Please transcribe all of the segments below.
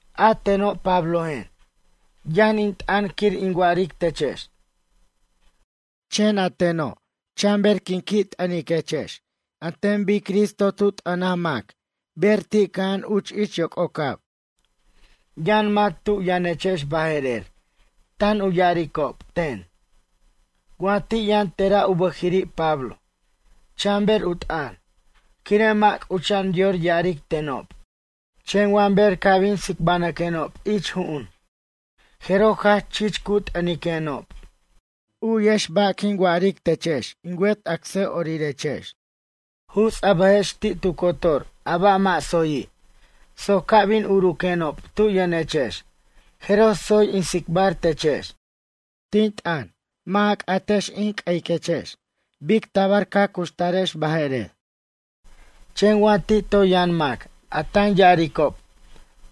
A teno' Pablojen, yʌn in t'ʌn quir in wa'aric techex. Chen a teno' chanber quin qui' t'ʌniquechex an ten bic Cristo t'ʌnij mac ber ti' cʌja'an uch ich yoc'ocab. Yʌn mac tu yʌnechex baje'rer tan u ya'aricob ten: “Wa ti' yʌn tera' u bʌjiri' Pablo, chanber u t'ʌn, quire' mʌ' c'ucha'an yor ya'aric tenob. Chen wa ber ca' bin tsibanʌquenob ich ju'un, jeroj jach chich cu t'ʌniquenob.” U'yex ba' quin wa'aric techex in wet acsa'orirex. Juts' a bʌjex ti' tu cotor a ba' mʌ' tsoyi', soc ca' bin uruquenob tu yʌnechex jeroj tsoy in tsicbar techex. Tin t'ʌn, mʌ' a c'atex in q'ueyiquex bic tabar ca cuxtarex baje'rer. Chen wa ti' toy yʌn mac a tan ya'aricob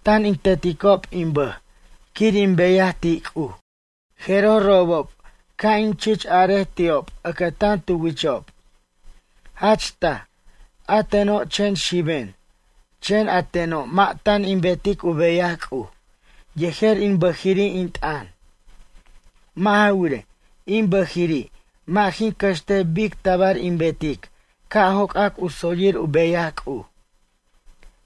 tan in teticob in bʌj quir in beyaj ti' C'uj, jeroj robob ca' in chich arej ti'ob ʌcʌtan tu wichob. Jach taj, a teno' chen xiben, chen a teno' mʌ' tan in betic u beyaj C'uj yejer in bʌjiri' in t'ʌn. Mʌ' ja wirej, in bʌjiri' mʌ' jin cʌxtej bic tabar in betic ca' joc'ac u tsoyir u beyaj C'uj.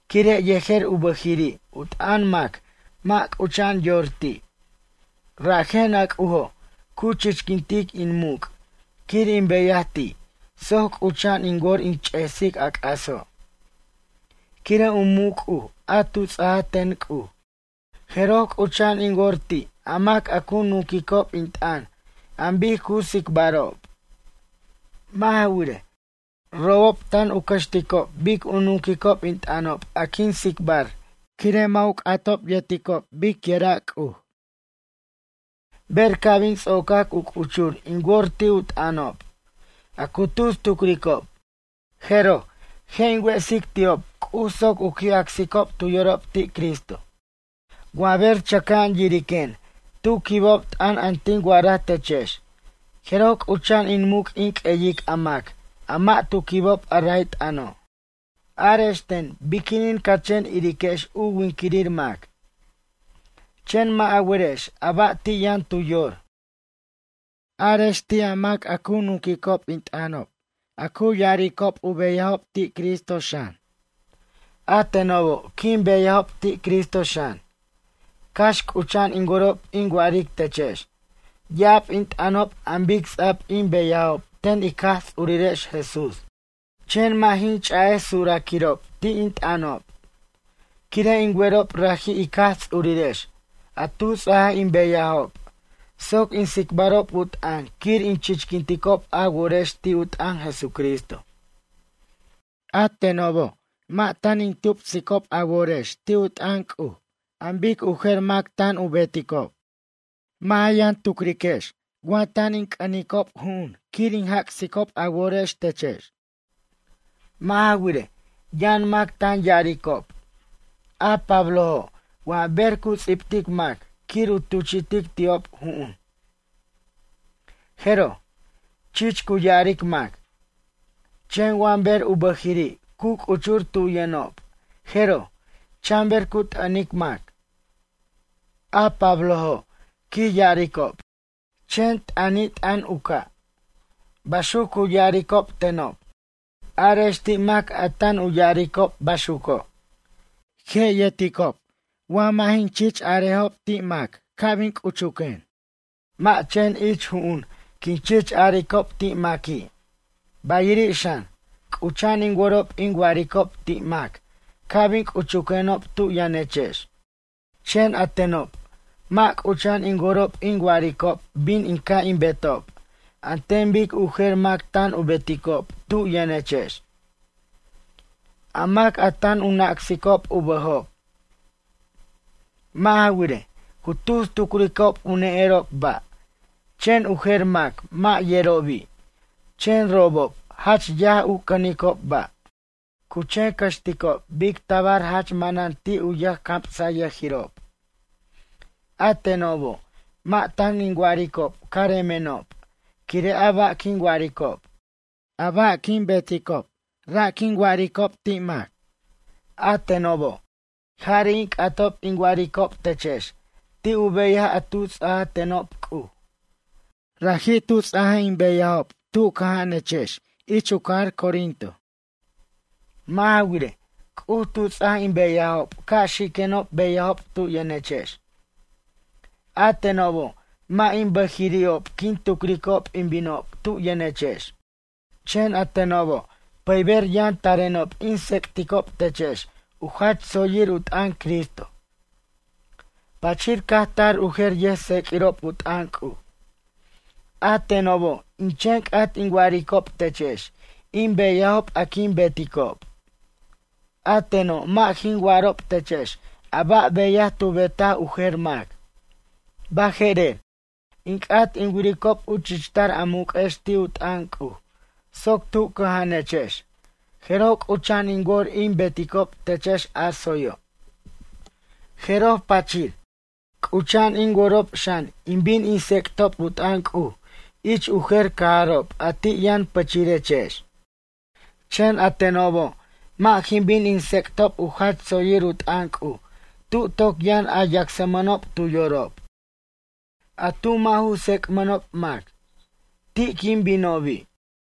Quire' yejer u bʌjiri' u t'ʌn mac mʌ' c'ucha'an yor ti'. Rajen a C'ujo' cu chichquintic in muc' quir in beyaj ti' soc c'ucha'an in wor in ch'esic a c'aso'. Quire' u muc' C'uj a tu ts'aj ten C'uj, jeroj c'ucha'an in wor ti' a mac a cu nunquicob in t'ʌn an bic cu tsicbarob. Mʌ' ja wirej, robob tan u cʌxticob bic u nunquicob in t'ʌnob a quin tsicbar quire' mʌ' u c'atob yerticob biquira' C'uj. Ber ca' bin ts'ocac u c'uchur in wor ti' u t'ʌnob, a cu tus tucricob, jeroj je' in wesic ti'ob C'uj soc u qui' acsicob tu yorob ti' Cristo. Wa ber chʌca'an yiriquen tu quibob t'ʌn a tin wa'araj techex jeroj c'ucha'an in muc' in q'ueyic a mac a mʌ' tu quibob a ray t'ʌno'. Arex ten biquinin ca chen iriquex u winquirir mac, chen mʌ' a werex a ba' ti' yʌn tu yor? Arex ti' a mac a cu nunquicob in t'ʌnob a cu ya'aricob u beyajob ti' Cristo xan, a tenobo' quin beyajob ti' Cristo xan. Cax c'ucha'an in worob in wa'aric techex ya'ab in t'ʌnob an bic ts'a'b in beyajob ten ic Jaj Ts'urirex Jesús, chen mʌ' jin ch'a'ej suraquirob ti' in t'ʌnob. Quire' in werob raji' ic Jaj Ts'urirex a tu ts'aj in beyajob soc in tsicbarob u t'ʌn quir in chichquinticob a worex ti' u t'ʌn Jesucristo. A tenobo' mʌ' tan in tupsicob a worex ti' u t'ʌn C'uj an bic u jer mac tan u beticob. Mʌ' a yʌn tucriquex tan in c'ʌnicob ju'un quir in jac'sicob a worex techex. Mʌ' ja wirej, yʌn mac tan ya'aricob: “A Pablojo' wa ber cu ts'ibtic mac quir u tuchi'tic ti'ob ju'un, jeroj, chich cu ya'aric mac. Chen wa ber u bʌjiri' cu c'uchur tu yʌnob jeroj, chanber cu t'ʌnic mac. A Pablojo', quij ya'aricob, chen t'ʌnit'ʌn u ca'.” Baxuc cu ya'aricob tenob. Arex ti' mac a tan u ya'aricob baxuco'. Je' yerticob wa mʌ' jin chich arejob ti' mac ca' bin c'uchuquen. Mʌ' chen ich ju'un quin chich aricob ti' maqui'. Bayiri' xan, c'ucha'an in worob in wa'aricob ti' mac ca' bin c'uchuquenob tu yʌnechex. Chen a tenob mʌ' c'ucha'an in worob in wa'aricob bin ca' in betob an ten bic u jer mac tan u beticob tu yʌnechex, a mac a tan u nacsicob u bʌjob. Mʌ' ja wirej, cu tus tucricob u ne'erob ba', chen u jer mac mʌ' yerobi', chen robob jach yaj u cʌnicob ba'. Cu chen cʌxticob bic tabar jach manan ti' u yʌjcamsayʌjirob. A tenobo' mʌ' tan in wa'aricob caremenob quire' a ba' quin wa'aricob. A ba' quin beticob ra' in wa'aricob ti' mac. A tenobo', jari' in c'atob in wa'aricob techex ti' u beyaj a tu ts'aj tenob C'uj. Raji' tu ts'aj in beyajob tu cʌja'anechex ich u cajar Corinto. Mʌ' ja wirej, C'uj tu ts'aj in beyajob ca' xiquenob beyajob tu yʌnechex. A tenobo' mʌ' in bʌjiri'ob quin tucricob in binob tu yʌnechex. Chen a tenobo' pʌyber yʌn tarenob in tsec'ticob techex u jach tsoyir u t'ʌn Cristo. Pachir caj tar u jer yʌjtseq'uirob u t'ʌn C'uj. A tenobo' in chen c'at in wa'aricob techex in beyajob a quin beticob. A teno' mʌ' jin wa'arob techex a ba' beyaj tu betaj u jer mac. Baje'rer, in c'at in wiricob u chichtar a muq'uex ti' u t'ʌn C'uj soc tu cʌja'anechex jeroj, c'ucha'an in wor in beticob techex a tsoyo'. Jeroj pachir, c'ucha'an in worob xan in bin in tsec'tob u t'ʌn C'uj ich u jer cajarob a ti' yʌn pʌchirechex. Chen a tenobo' mʌ' jin bin in tsec'tob u jach tsoyir u t'ʌn C'uj tu toc yʌn a yacsmʌnob tu yorob. A tu mʌ' ju tsec'mʌnob mac, ti' quin binobi'.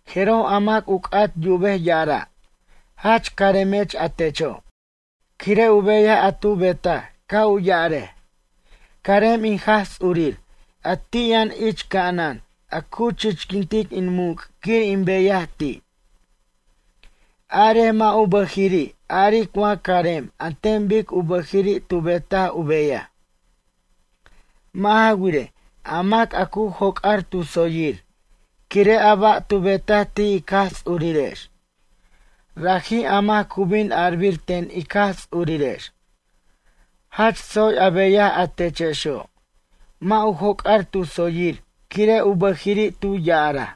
Jeroj a mac u c'at yubej ya'ara': “Jach caremech a techo'”, quire' u beyaj a tu betaj ca' u ya'arej: “Carem in Jaj Ts'urir a ti' yʌn ich ca'anan a cu chichquintic in muc' quir in beyaj ti'.” Arej mʌ' u bʌjiri' aric wa carem an ten bic u bʌjiri' tu betaj u beyaj. Mʌ' ja wirej, a mac a cu joc'ar tu tsoyir quire' a ba' tu betaj ti' ic Jaj Ts'urirex, raji' a mac cu bin arbir ten ic Jaj Ts'urirex: “Jach tsoy a beyaj a techexo'”, mʌ' u joc'ar tu tsoyir quire' u bʌjiri' tu ya'araj.